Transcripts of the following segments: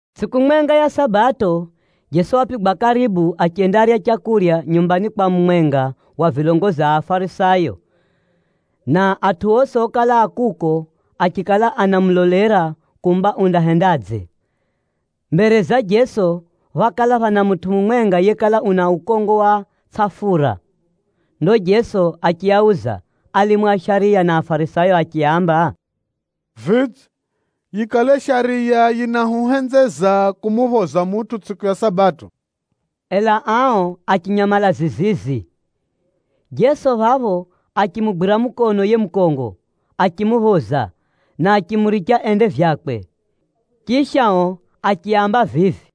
Tsʼiku mwenga ya Sabato, Jeso wapigwa karibu achendarya leu nyumbani kwa mumwenga wa vilongozi a Afarisayo, na atʼu osi okala a kuko achikala anamulolera kumba undahendadze. Mbere za Jeso phákala phana mutʼu mumwenga yekala una ukongo wa tsʼafura. Ndo Jeso achiauza alimu a shariya na Afarisayo achiaamba, “Vidze, yikale shariya yinahuhenzeza kumuphoza mutʼu tsʼiku ya Sabato?” Ela ao achinyamala zizizi. Jeso phapho achimugwira mukono yiye mukongo, achimuphoza na achimuricha ende vyakwe. Chisha o achiaamba vivi,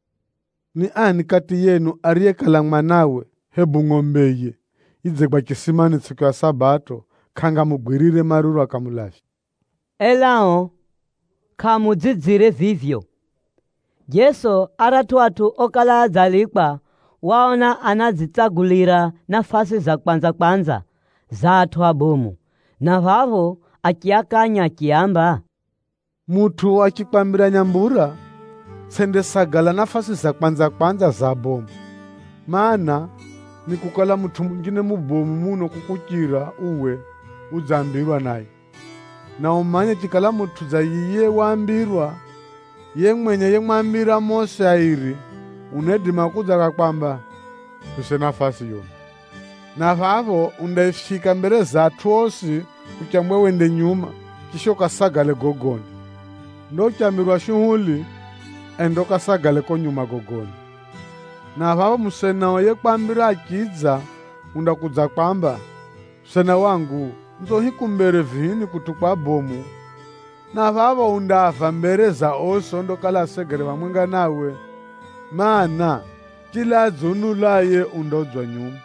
“Ni ani kati yenu ariye kala mwanawe Nakala zinjine zinaamba: pʼundawe. hebu ngʼombeye yidzegwa chisimani tsʼiku ya Sabato, kʼangamugwirire maruru akamulavya?” Ela o kʼaamuudzidzire vivyo. Jeso aratʼu atʼu okala adzalikwa waaona anadzitsagulira nafasi za kwanza-kwanza za atʼu abomu, na phapho achiakanya achiaamba, “Mutʼu achikwambira nyambura, tsʼendesagala nafasi za kwanza-kwanza za abomu, mana, nikukala mutʼu munjine mubomu muno kukuchira uwe udzambirwa naye. Na umanye chikala mutʼu dza yiye waambirwa, yiye mwenye yemwambira mosi airi unaidima kudza akakwamba, ‘Muphise nafasi yuno.’ Na phapho undaifyika mbere za atʼu osi uchambwa wende nyuma, chisha ukasagale gogoni. Ndo uchambirwa shuhuli, enda ukasagale ko nyuma gogoni, na phapho musenao yekwambira achidza undakudzakwamba, ‘Musena wangu, nzo hiku mbere vihini kutʼu kwa abomu.’ Na phapho undaava mbere za osi ondakala asegere phamwenga nawe. Maana, chila adziunulaye, undaudzwa nyuma,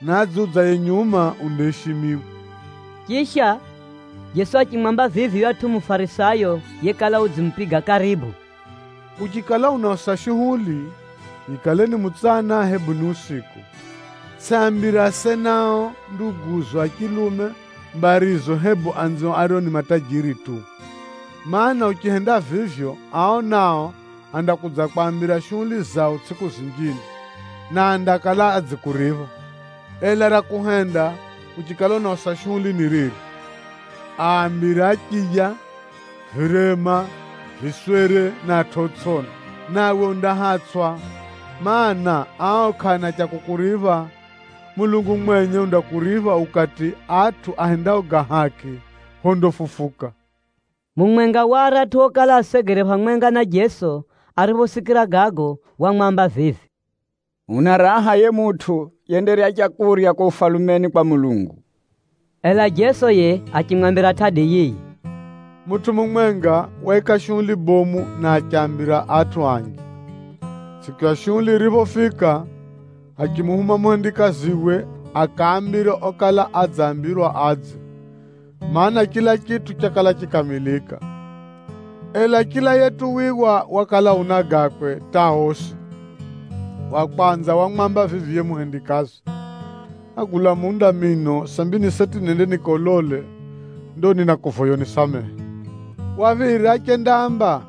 na adziudzaye nyuma, undaishimiwa.” Chisha, Jeso achimwamba vivi yuyatʼu Mufarisayo yekala udzimupiga karibu, “Uchikala unausa shuhuli, yikale ni mutsana hebu ni usiku, tsʼiaambire asenao, nduguzo a chilume, mbarizo hebu anzio ario ni matajiri tu. Maana, uchihenda vivyo, ao nao andakudzakwambira shuhuli zao tsʼiku zinjine, na andakala adzikuripha. Ela ra kuhenda uchikala unausa shuhuli ni riri. Aambire achiya, virema, viswere na atʼu otsʼiona, nawe undahatsʼwa, mana, ao kʼaana cha kukuripha. Mulungu mwenye undakuripha ukati atʼu ahendao ga haki phondafufuka.” Mumwenga wa aratʼu okala asegere phamwenga na Jeso ariphosikira gago, wamwamba vivi, “Una raha yiye mutʼu yendarya leu ko Ufalumeni kwa Mulungu.” Ela Jeso yiye achimwambira tʼadi yiyi, “Mutʼu mumwenga waika shuhuli bomu na achiaambira atʼu anji. Tsʼiku ya shuhuli yiriphofika, achimuhuma muhendikaziwe akaambire okala adzambirwa adze, mana, chila chitʼu chakala chikamilika. Ela chila yetuwiwa wakala una gakwe hata osi. Wa kwanza wamwamba vivi yiye muhendikazi, ‘Nágula munda mino, sambi ni seti nende nikaulole. Ndo ninakuvoya unisamehe.’ Wa phiri achendaamba,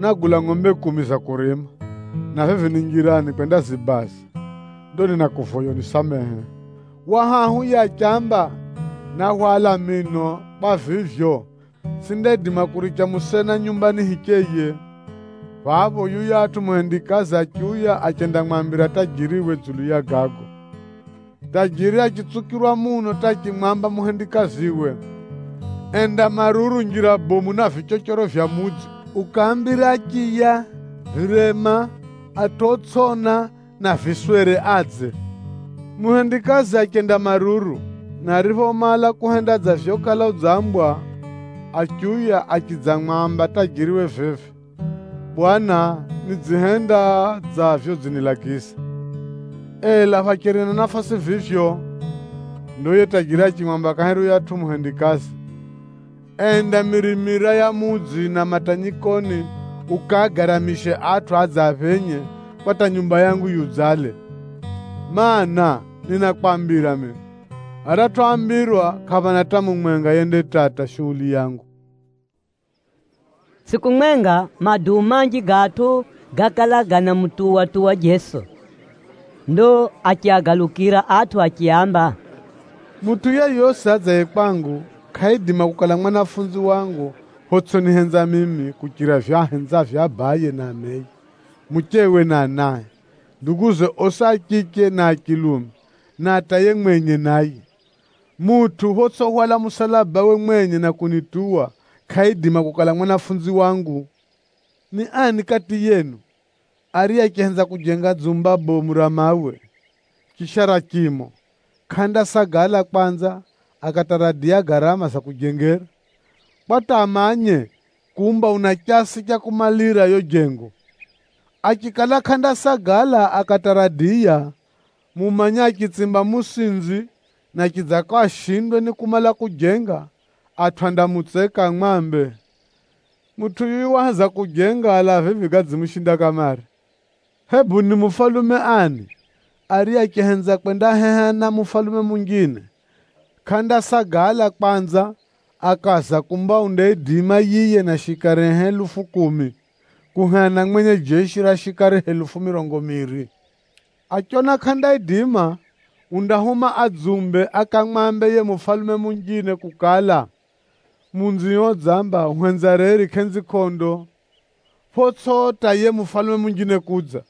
‘Nágula ngʼombe kumi za kurima, na vivi ni njirani kwendazibaza. Ndo ninakuvoya unisamehe.’ Wa hahu yiye achiamba, ‘Náhwala mino, kwa vivyo, tsʼindaidima kuricha musena nyumbani hicheye.’ Phapho yuyatʼu muhendikazi achiuya achendamwambira tajiriwe dzulu ya gago. Tajiri achitsukirwa muno hata achimwamba muhendikaziwe, ‘Enda maruru njira bomu na vichochoro vya mudzi, ukaambire achiya, virema, atʼu otsʼiona na viswere adze.’ Muhendikazi achenda maruru, na ariphomala kuhenda dza vyokala udzambwa, achiuya achidzamwamba tajiriwe vivi, ‘Bwana, nidzihenda dza vyodzinilagiza, ela phacheri na nafasi vivyo.’ Ndo yiye tajiri achimwamba kahiri yuyatʼu muhendikazi, ‘Enda mirimira ya mudzi na matanyikoni ukaagaramishe atʼu adze aphenye, kwa hata nyumba yangu yiudzale. Maana, ninakwambira mino, aratʼu oambira kʼaphana hata mumwenga yendatata shuhuli yangu.’” Tsʼiku mwenga, maduu manji ga atʼu gákala ganamutuwa-tuwa Jeso. Ndo achiagalukira atʼu achiaamba, “Mutʼu yeyosi adzaye kwangu, kʼaidima kukala mwanafunzi wangu photsʼinihenza mimi kuchira vivyo ahenzavyo abaye na ameye, muchewe na anae, nduguze osi a chiche na a chilume na hata yiye mwenye naye. Mutʼu photsʼihwala musalabawe mwenye na kunituwa, kʼaidima kukala mwanafunzi wangu. Ni ani kati yenu, ariye achihenza kujenga dzumba bomu ra mawe, chisha ra chimo, kʼandasagala kwanza akataradiya garama za kujengera, kwa hata amanye kumba una chasi cha kumalira yo jengo? Achikala kʼandasagala akataradiya, mumanye achitsimba musinzi na chidzako ashindwe ni kumala kujenga, atʼu andamutseka amwambe, ‘Mutʼu yuyu waheza kujenga, ela vivi gadzimushinda kamare.’ “Hebu ni mufalume ani, ariye achihenza kwendaheha na mufalume munjine, kʼandasagala kwanza akaaza kumba undaidima yiye na shikarie helufu kumi, kuheha na mwenye jeshi ra shikari helufu mirongo miiri? Achiona kʼandaidima, undahuma adzumbe akamwambe yiye mufalume munjine kukala, ‘Munzio udzamba uhenza reri kʼenzi kʼondo,’ photsʼi hata yiye mufalume munjine kudza.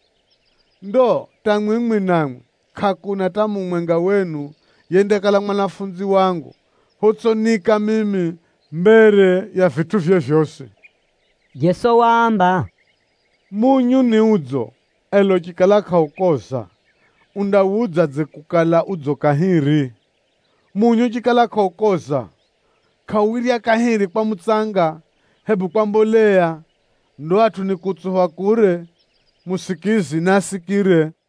Ndo hata mwimwi namwi, kʼakuna hata mumwenga wenu yendakala mwanafunzi wangu photsʼiniika mimi mbere ya vitʼuvye vyosi.” Jeso waamba, “Munyu ni udzo, ela uchikala kʼaukoza, undawudzadze kukala udzo kahiri? Munyu uchikala kʼaukoza, kʼauwirya kahiri kwa mutsanga, hebu kwa mboleya. Ndo atʼu nikuutsupha kure. Musikizi naasikire!”